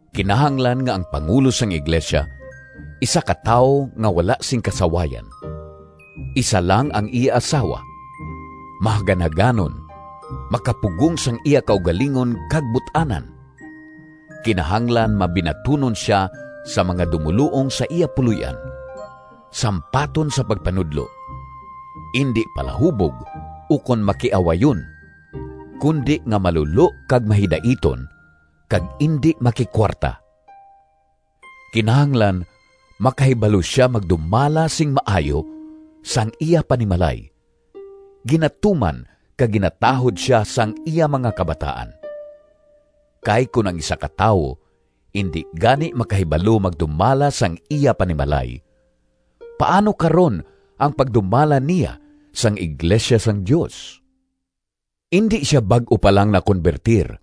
Kinahanglan nga ang pangulo sang iglesia isa ka tawo nga wala sing kasawayan, isa lang ang iya asawa, mahaganhaganon, makapugong sang iya kaugalingon kag but-anan, kinahanglan mabinatunon sia sa mga dumoluong sa iya puloy-an, sampaton sa pagpanudlo; indi palahubog ukon makiawayon, kundi nga malulo kag mahidaiton, kag indi makikuwarta. Kinahanglan makahibalo sia magdumala sing maayo sang iya panimalay, ginatuman kag ginatahod sia sang iya mga kabataan. Kay kon ang isa ka tawo indi gani makahibalo magdumala sang iya panimalay, paano karon ang pagdumala niya sang iglesia sang Dios? Indi sia bag-o pa lang nakonbertir,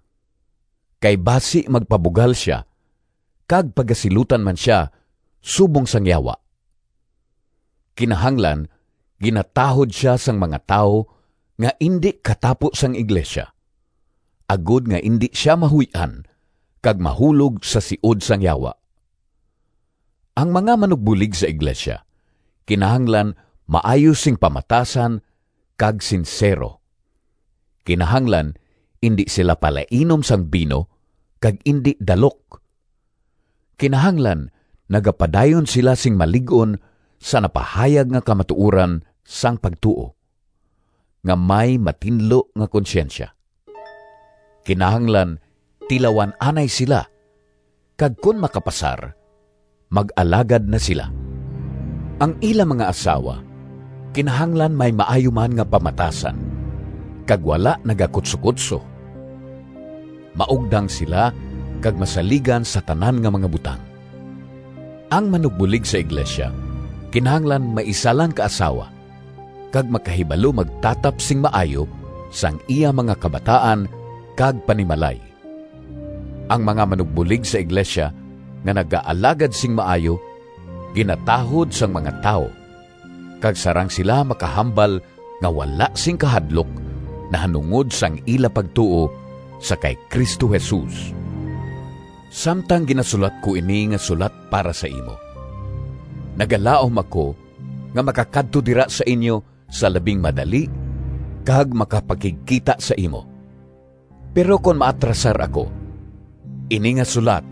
kay basi magpabugal sia kag pagasilutan man sia subong sang Yawa. Kinahanglan ginatahod sia sang mga tawo nga indi katapo sang iglesia, agod nga indi sia mahuy-an kag mahulog sa siod sang Yawa. Ang mga manugbulig sa iglesia kinahanglan maayo sing pamatasan kag sinsero. Kinahanglan indi sila palainom sing bino kag indi dalok. Kinahanglan nagapadayon sila sing malig-on sa napahayag nga kamatuoran sang pagtuo, nga may matinlo nga konsyensya. Kinahanglan tilawan anay sila, kag kon makapasar, mag-alagad na sila. Ang ila mga asawa kinahanglan may maayo man nga pamatasan kag wala nagakutsokutso. Maugdang sila kag masaligan sa tanan nga mga butang. Ang manugbulig sa iglesia kinahanglan may isa lang ka asawa kag makahibalo magtatap sing maayo sang iya mga kabataan kag panimalay. Ang mga manugbulig sa iglesia nga nagaalagad sing maayo ginatahod sang mga tawo kag sarang sila makahambal nga wala sing kahadlok nahanungod sang ila pagtuo sa kay Cristo Jesus. Samtang ginasulat ko ini nga sulat para sa imo, nagalaom ako nga makakadto dira sa inyo sa labing madali kag makapakigkita sa imo. Pero kon maatrasar ako, ini nga sulat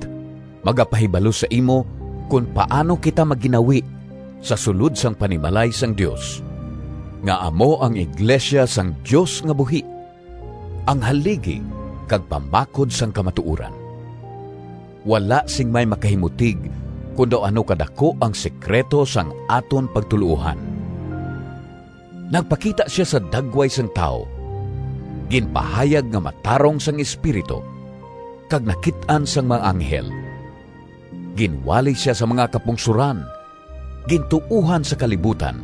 magapahibalo sa imo kon paano kita magginawi sa sulod sang panimalay sang Dios, nga amo ang iglesia sang Dios nga buhi, ang haligi kag pamakod sang kamatuoran. Wala sing may makahimutig kon daw ano kadaku ang sekrito sang aton pagtuloohan! Nagpakita sia sa dagway sang tawo, Ginpahayag nga matarong Sang Espiritu, Kag nakit-an sang mga anghel. Ginwali sia sa mga kapungsoran, Gintuohan sa kalibutan,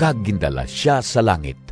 Kag gindala sia sa langit.